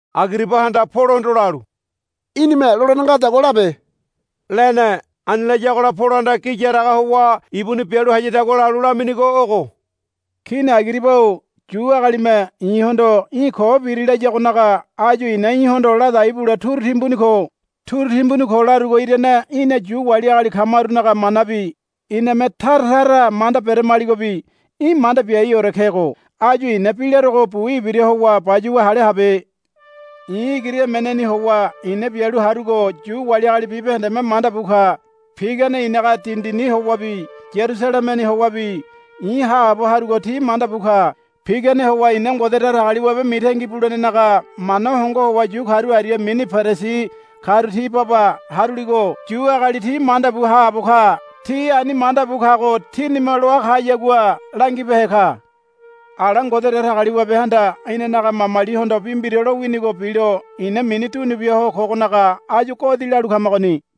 Agiribahanda Polohondo lalu, Í̠nime lolene ngadagua labe, lene. Ani layagola Polohanda gi yaraga howa ibuni bialu hayadagua lalu laminigo ogo, Kini Agiriba-o Yu agalime i̱hondo, Í̠ ko biri, layagonaga áyu i̱na í̠hondo ladai bule turu timbuni ko. Turu timbuni ko larugo irane í̠na Yu wali agali kamarunaga manabi iname taratara manda beramaligobi í̠ manda biaiore kego. Áyu i̱na bi larogo bu ibira howa bayuwa hale habe. I̱ igiri emeneni howa i̱na bialu harugo Yu wali agali bibahendeme manda bu ka. Pigane i̱naga dindini howabi Yarusalemeni howabi i̱ haabo harugo ti manda bu ka. Pigane howa ina Ngode Datagaliwabe mitangi bulenenaga mana hongo howa yu karu aria mini Perisi karu ti baba haruligo Yu agali ti manda bu haabo ka. Ti ani manda bu kago tinime loa kayagua langibehe ka. Ala Ngode Datagaliwabehanda inanaga mamalihondo bi mbira lowinigo bilo i̱na mini dunu bia ho kogonaga áyu godi lalu kamagoni.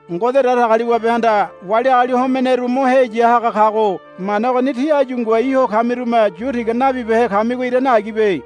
Ngode Datagaliwabehanda wali agali homeneru mo heya haga kago mana ogoni tí áyu ngoai ho kamirume yu tiga nabibehe kamigo irane agibe.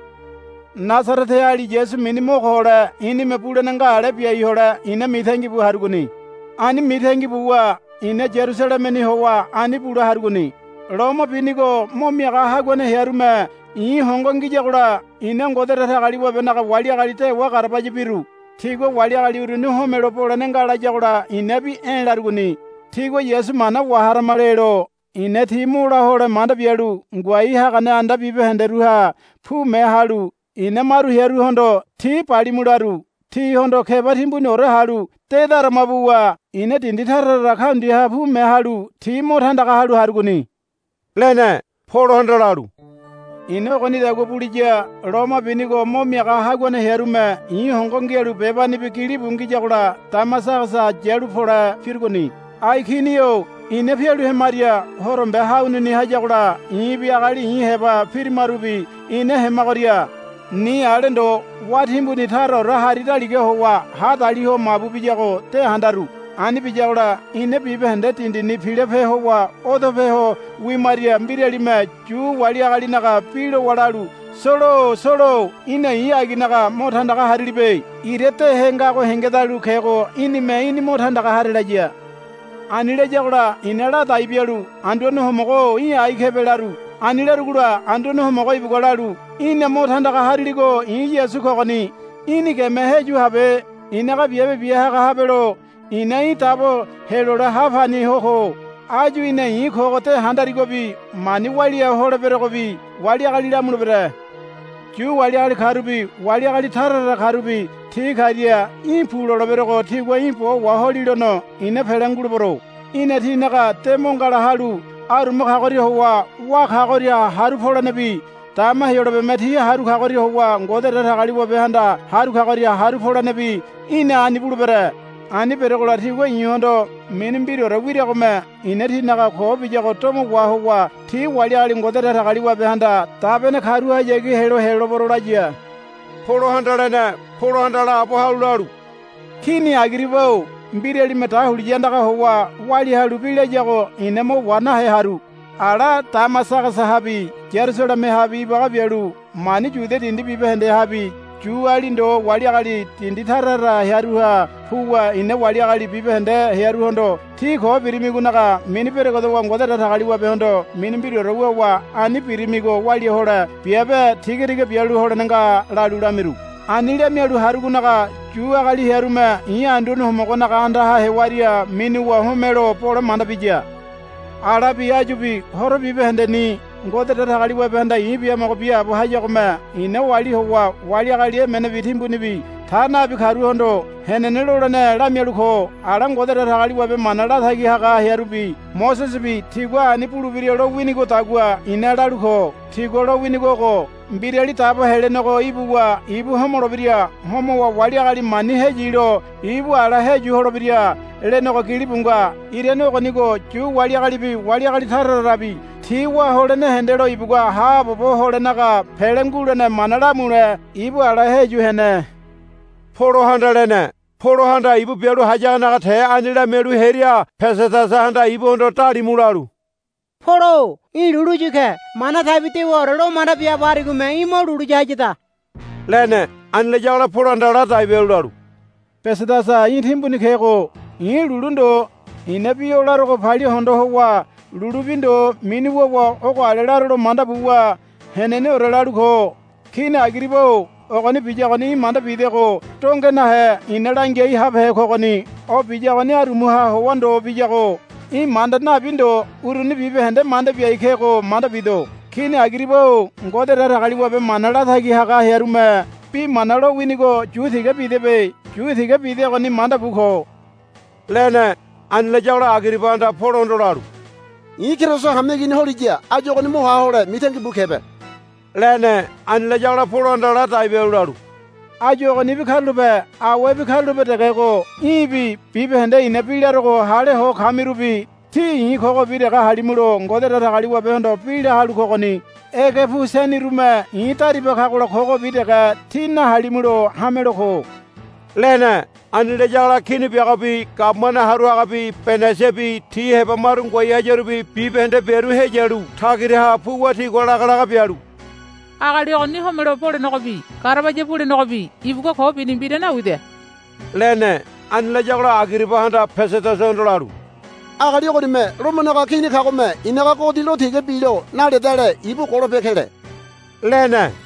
Nasareteali Yasu mini mo ko hole i̱nime bulene nga ale biai hole i̱na mitangi bu harugoni. Ani mitangi buwa i̱na Yarusalemeni howa ani bule harugoni. Loma binigo mo miaga haguane hearume i̱ hongo ngiyagola i̱na Ngode Datagaliwabenaga wali agali dewa garabaya biru. Tigua wali agali uruni homelo bolene nga layagola i̱nabi, E̱, larugoni. Tigua, Yasu mana waharama, lelo i̱na ti mo la hole manda bialu ngoai hagane anda bibahenderuha pume halu i̱na maru hearuhondo, Ti balimu, laru. Tihondo keba timbuniore halu de darama buwa i̱na dindi tara tara kaundiaha pume halu ti mo tandaga halu harugoni, lene. Polohanda lalu, I̱na ogonidagua buliya loma binigo mo miaga haguane hearume i̱ hongo ngialu bebanibi gilibu ngiyagola Damasagasa yalu pole pirugoni. Ai Kini-o ina pialu hemaria horombe hanuni hayagola i̱bi agali i̱ heba pirimarubi ina hemagoria ni ale ndo wá timbuni taraore hari daliga howa hadali ho mabu biyago de handaru. Ani biyagola ina bibahende dindini pilope howa odope ho wimaria mbiralime Yu wali agalinaga bi lowa lalu, Solo-o Solo-o í̠na i̱ aginaga mo tandaga harilibe. Ira dehe ngago hengedalu kego í̠nime í̠ni mo tandaga hare, laya. Ani layagola i̱na ladai bialu, Anduane Homogo-o í̠ ai kebe, laru. Ani larugola Anduane Homogo ibugua lalu, Í̠na mo tandaga hariligo i̱ Yasu kogoni. Í̠ni geme heyu habe. I̱naga biabe bia haga habelo i̱na í̠ dabo helole ha pani ho ko. Áyu í̠na i̱ kogo de handarigobi mani walia holeberogobi wali agali lamulebere. Yu wali agali karubi wali agali tara tara karubi ti karia í̠ pu loleberogo tigua í̠ bo waholilono i̱na pele ngulebero. Í̠na tinaga de mo ngala halu aruma kagoria howa wá kagoria haru polenebi dama Heyolabeme ti haru kagoria howa Ngode Datagaliwabehanda haru kagoria haru polenebi í̠na ani bulebere. Ani beregola tigua i̱hondo mini mbiraore wiragome i̱na tinaga ko biyago domo wahowa ti wali agali Ngode Datagaliwabehanda dabene karuhayagi helo helolebero, laya, Polohanda lene. Polohanda laabo halu lalu, Kini Agiriba-o mbiralime dahuliya andaga howa walia halu bi layago i̱na mo wa nahe haru. Ala Damasagasahabi Yarusalemehabi ibaga bialu mani Yudia dindi bibahendehabi Yuali ndo wali agali dindi tara tara hearuha puwa i̱na wali agali bibahende hearuhondo, Tí ko birimigonaga mini beregedowa Ngode Datagaliwabehondo mini mbiraore wuwa ani birimigo walia hole biabe tigatiga bialu holene nga, lalu lamiru. Ani lamialu harugonaga Yu agali hearume i̱ Anduane Homogonaga andaha hewaria minuwa homelo bole manda biya. Alabi áyubi horo bibahendeni Ngode Datagaliwabehanda i̱ biamogo biaabo hayagome i̱na oali howa wali agali emenebi timbunibi ta nabi karuhondo henene lolene lamialu ko. Ala Ngode Datagaliwabe mana latagi haga hearubi Mosesebi tigua ani bulebira lo winigodagua i̱na lalu ko. Tigua lowinigo ogo, Mbirali Dabo Helenego ibuwa ibu homolebira. Homowa wali agali mani heyilo ibu ala heyu holebira, lenego gilibu nga. Irane ogonigo Yu wali agalibi wali agali tara tarabi ti wá holene hendelo ibugua haabobo holenaga pele ngulene mana lamule ibu ala heyu hene, Polohanda lene. Polohanda ibu bialu hayagonaga te ani lamialu hearia Pesedasahanda ibuhondo dalimu lalu, Polo-o í̠ lulu yu ke. Mana taibi dewaore lo manda biaabo harigome í̠ mo lulu ya hayada, lene. Ani layagola Polohanda ladai bialu lalu, Pesedasa í̠ timbuni kego. I̱ lulu ndo. I̱na bi o larogo palia hondo howa lulu bi ndo mini wuwa ogo ale larolo manda buwa heneneore lalu ko. Kini Agiriba-o ogoni biyagoni í̠ manda bidego donge nahe i̱na langiai habehe kogoni. O biyagoni arumaha howa ndo biyago í̠ manda nabi ndo uruni bibahende manda biai kego manda bido. Kini Agiriba-o Ngode Datagaliwabe mana latagi haga hearume bi mana lowinigo yu tiga bidebe. Yu tiga bidegoni manda bu ko, lene. Ani layagola Agiribahanda Polohondo lalu, I̱ Keriso hameigini holiya áyu ogoni mo ha hole mitangi bu kebe, lene. Ani layagola Polohanda ladai bialu lalu, Áyu ogonibi karulape awebi karulape degego í̠bi bibahende i̱na bi larogo hale ho kamirubi tí i̱ kogobi dege halimulo Ngode Datagaliwabehondo bi la halu kogoni. Ege pu seni urume i̱ dariba kagola kogobi dege tí nahalimulo hamelo ko, lene. Ani layagola kini biagobi gabumane haru hagabi Benaisibi ti heba maru ngoai hayarubi bibahende biaru heyalu tagiraha puwa tigua lagalaga bialu, Agali ogoni homelo bolenegobi garabaya bulenegobi ibugua ko bini mbira nawida, lene. Ani layagola Agiribahanda Pesedasahondo lalu, Agali ogonime Lomonaga Kini kagome i̱naga godi lo tiga bilo naledale ibu golope kele, lene.